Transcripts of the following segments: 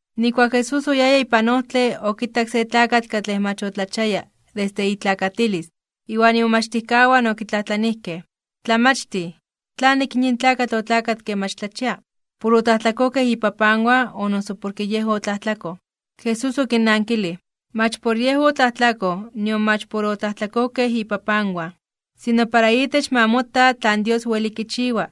Nijkuak Jesús oyaya ipan ojtle, okitak se tlakatl katlej mach otlachiaya desde itlakatilis. Iwan imomachtijkawan okitlajtlanijkej: ―Tlamachtij, ¿tlanik yin tlakatl otlakatke mach tlachia? ¿Por otlajtlakojkej ipapanwan, o noso porke yej otlajtlakoj? Jesús okinnankilij: ―Mach por yej otlajtlakoj nion mach por otlajtlakojkej ipapanwan. Sino para itech ma mota tlan Dios weli kichiwa.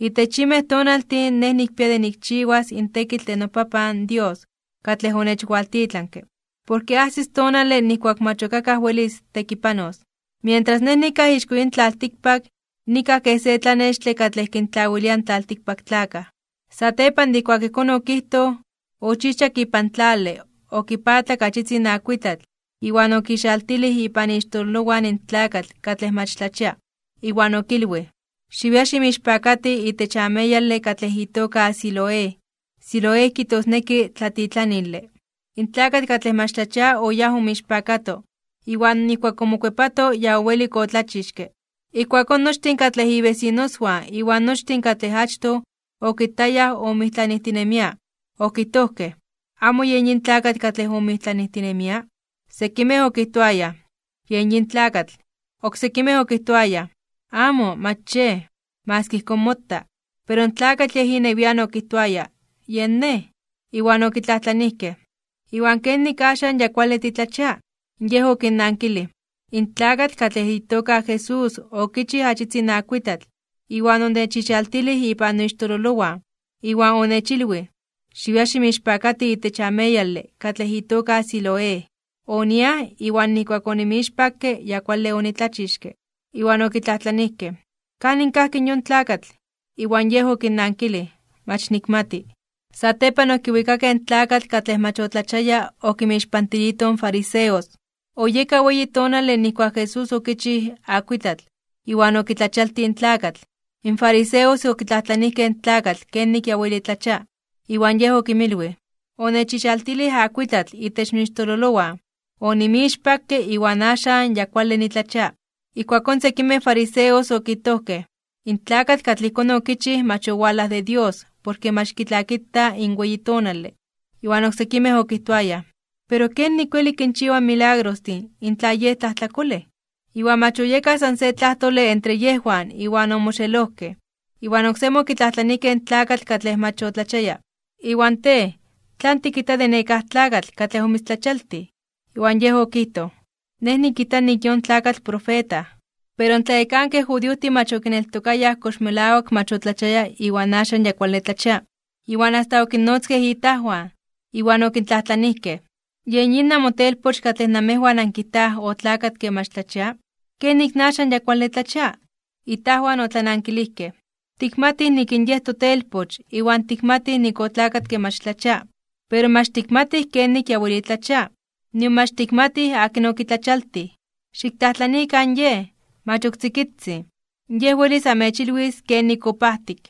Itech yinmej tonaltin Nej nikpia de nikchiwas in tekitl de noPapan Dios katlej onechwaltitlanke, porke ajsis tonale nijkuak mach ok akaj welis tekipanos. Mientras Nej nikaj ixko yin tlaltikpak, nikaj kej se tlanextle katlej kinyoltlawilia in tlaltikpaktlakaj. Satepan de ijkuak ijkón okijtoj, ochijchak ipan tlale, okipaatlak achitzin akuitlatl iwan okixaltilij ipan ixtololowan in tlakatl katlej mach tlachia. Iwan okilwij: ―Xiwia ximixpakati itech ameyale katlej itoka Siloé ―Siloé kijtosneki Tlatitlanile. In tlakatl katlej mach tlachia oyáj omixpakato. Iwan nijkuak omokuepato ya owelik otlachixke. Ijkuakón nochtin katlej ibesinoswan iwan nochtin katlej achtoj okitayaj omijtlanijtinemia, okijtojkej: ―¿Amo yen yin tlakatl katlej omijtlanijtinemia? Sekimej okijtoayaj: ―Yej yin tlakatl. Oksekimej okijtoayaj: ―Amo, mach yej. Maski ijkón mota. Pero in tlakatl yej inewian okijtoaya: ―Yen nej. Iwan okitlajtlanijkej: ―¿Iwan kenik axan ya kuale titlachia? Yej okinnankilij: ―In tlakatl katlej itoka Jesús okichij achitzin akuitlatl, iwan onechixaltilij ipan noixtololowan, iwan onechilwij: “Xiwia ximixpakati itech ameyale katlej itoka Siloé.” Oniaj, iwan nijkuak onimixpakke, ya kuale onitlachixke. Iwan okitlajtlanijkej: ―¿Kanin kajki in yon tlakatl? Iwan yej okinnankilij: ―Mach nikmati. Satepan okiwikakej in tlakatl katlej mach otlachiaya okinmixpantilijtoj in fariseos. Oyeka weyi tonale nijkuak in Jesús okichij akuitlatl, iwan okitlachialtij in tlakatl. In fariseos okitlajtlanijkej in tlakatl kenik ya weli tlachia. Iwan yej okinmilwij: ―Onechixaltilij akuitlatl itech noixtololowan, onimixpakke, iwan axan ya kuale nitlachia. Ijkuakón sekimej fariseos okijtojkej: ―In tlakatl katlej ijkón okichij mach owalaj de Dios, porke mach kitlakita in weyi tonale. Iwan oksekimej okijtoayaj: ―Pero, ¿kenik weli kinchiwa milagrostin in tla Yej tlajtlakolej? Iwan mach oyekaj san se tlajtole entre yejwan iwan omoxelojkej. Iwan oksemi okitlajtlanijkej in tlakatl katlej mach otlachiaya: ―¿Iwan tej, tlan tikijta de nekáj tlakatl katlej omitztlachialtij? Iwan yej okijtoj: ―Nej nikijta nik in yon tlakatl profeta. Pero in tlayekankej judiojtin mach okineltokayaj kox melawak mach otlachiaya iwan axan ya kuale tlachia, iwan asta okinnotzkej itajwan. Iwan okintlajtlanijkej: ―¿Yen yin namotelpoch katlej namejwan ankijtaj otlakatke mach tlachia? ¿Kenik in axan ya kuale tlachia? Itajwan otlanankilijkej: ―Tikmatij nik in yej totelpoch, iwan tikmatij nik otlakatke mach tlachia. Pero mach tikmatij kenik ya weli tlachia, nion mach tikmatij akin okitlachialtij. Xiktlajtlanikan yej, mach ok tzikitzin, yej welis amechilwis kenik opajtik.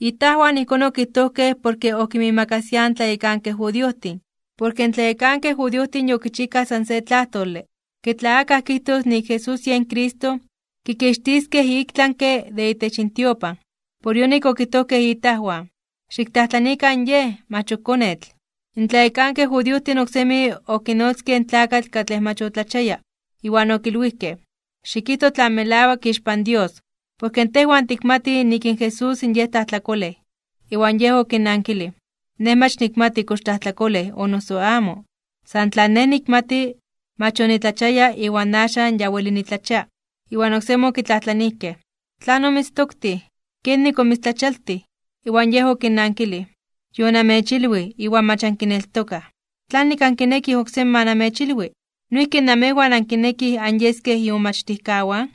Itajwan ijkón okijtojkej porke okinmiimakasiaj in tlayekankej judiojtin, porke in tlayekankej judiojtin yokichijkaj san se tlajtole ke tla akaj kijtos nik Jesús yen Cristo, kikixtiskej iktlanke (ik tlami) de itech intiopan. Por yonik okijtojkej itajwan: “Xiktlajtlanikan yej, mach ok konetl.” In tlayekankej judiojtin oksemi okinotzkej in tlakatl katlej mach otlachiaya, iwan okilwijkej: ―Xikijto tlan melawak ixpan Dios. Porke tejwan tikmatij nik in Jesús Yej tlajtlakolej. Iwan yej okinnankilij: ―Nej mach nikmati kox tlajtlakolej o noso amo. San tlan nej nikmati, mach onitlachiaya iwan axan ya weli nitlachia. Iwan oksemi okitlajtlanijkej: ―¿Tlan omitztoktij? ¿Kenik omitztlachialtij? Iwan yej okinnankilij: ―Yonamechilwij, iwan mach ankineltokaj, ¿tlanik ankinekij oksemi ma namechilwi? ¿Noijki namejwan ankinekij anyeskej imomachtijkawan?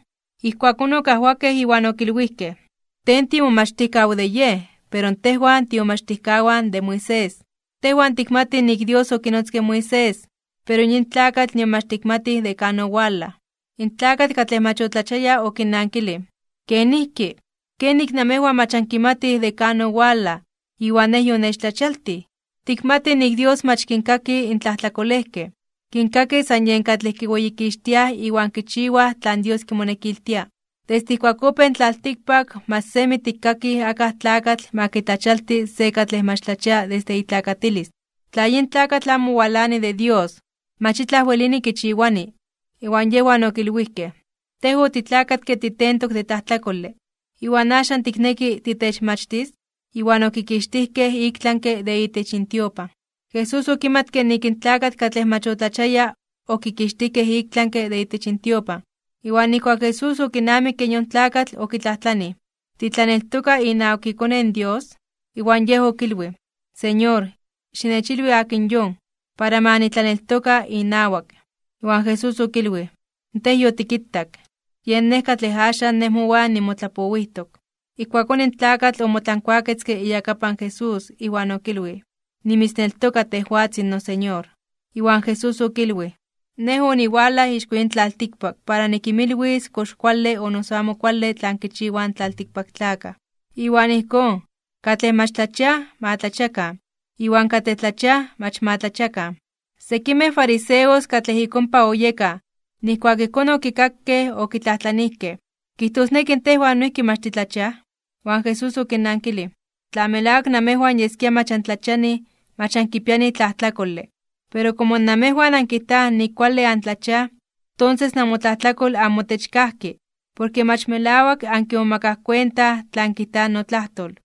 Ijkuakón okajwakej iwan okilwijkej: ―Tej tiimomachtijkaw de Yej. Pero tejwan tiimomachtijkawan de Moisés. Tejwan tikmatij nik in Dios okinotzke in Moisés, pero yin tlakatl nion mach tikmatij de kan owalaj. In tlakatl katlej mach otlachiaya okinnankilij: ―¿Kenijki? ¡Kenik namejwan mach ankimatij de kan owalaj, iwan nej yonechtlachialtij! Tikmatij nik in Dios mach kinkaki in tlajtlakolejkej. Kinkaki san yen katlej kiweyikixtiaj iwan kichiwaj tlan Dios kimonekiltia. Desde ijkuak opéj in tlaltikpak mach semi tikkakij akaj tlakatl ma kitlachialti se katlej mach tlachia desde itlakatilis. Tla yin tlakatl amo walani de Dios, mach itlaj welini kichiwani. Iwan yejwan okilwijkej: ―Tej otitlakatke titentok de tlajtlakole, ¿iwan axan tikneki titechmachtis? Iwan okikixtijkej iktlanke (ik tlami) de itech intiopan. Jesús okimatke nik in tlakatl katlej mach otlachiaya okikixtijkej iktlanke (ik tlami) de itech intiopan. Iwan nijkuak in Jesús okinamikke yon tlakatl, okitlajtlanij: ―¿Titlaneltoka inawak iKone in Dios? Iwan yej okilwij: ―Señor, xinechilwi akin yon, para ma nitlaneltoka inawak. Iwan Jesús okilwij: ―Tej yotikitak. Yen Nej katlej axan Nej mowan nimotlapowijtok. Ijkuakón in tlakatl omotlankuaketzke iyakapan Jesús, iwan okilwij: ―Nimitzneltoka, tejwatzin noSeñor. Iwan Jesús okilwij: ―Nej oniwalaj ixko yin tlaltikpak para nikinmilwis kox kuale o noso amo kuale tlan kichiwaj in tlaltikpaktlakaj. Iwan ijkón, katlej mach tlachiaj ma tlachiakan, iwan katlej tlachiaj mach ma tlachiakan. Sekimej fariseos katlej ik ompa oyekaj, nijkuak ijkón okikakej, okitlajtlanijkej: ―¿Kijtosneki tejwan noijki mach titlachiaj? Iwan Jesús okinnankilij: ―Tla melawak namejwan yeskia mach antlachianij, mach ankipianij tlajtlakole. Pero komo namejwan ankijtaj nik kuale antlachiaj, tonses namotlajtlakol amotech kajki, porke mach melawak ankimomakaj kuenta tlan kijta notlajtol.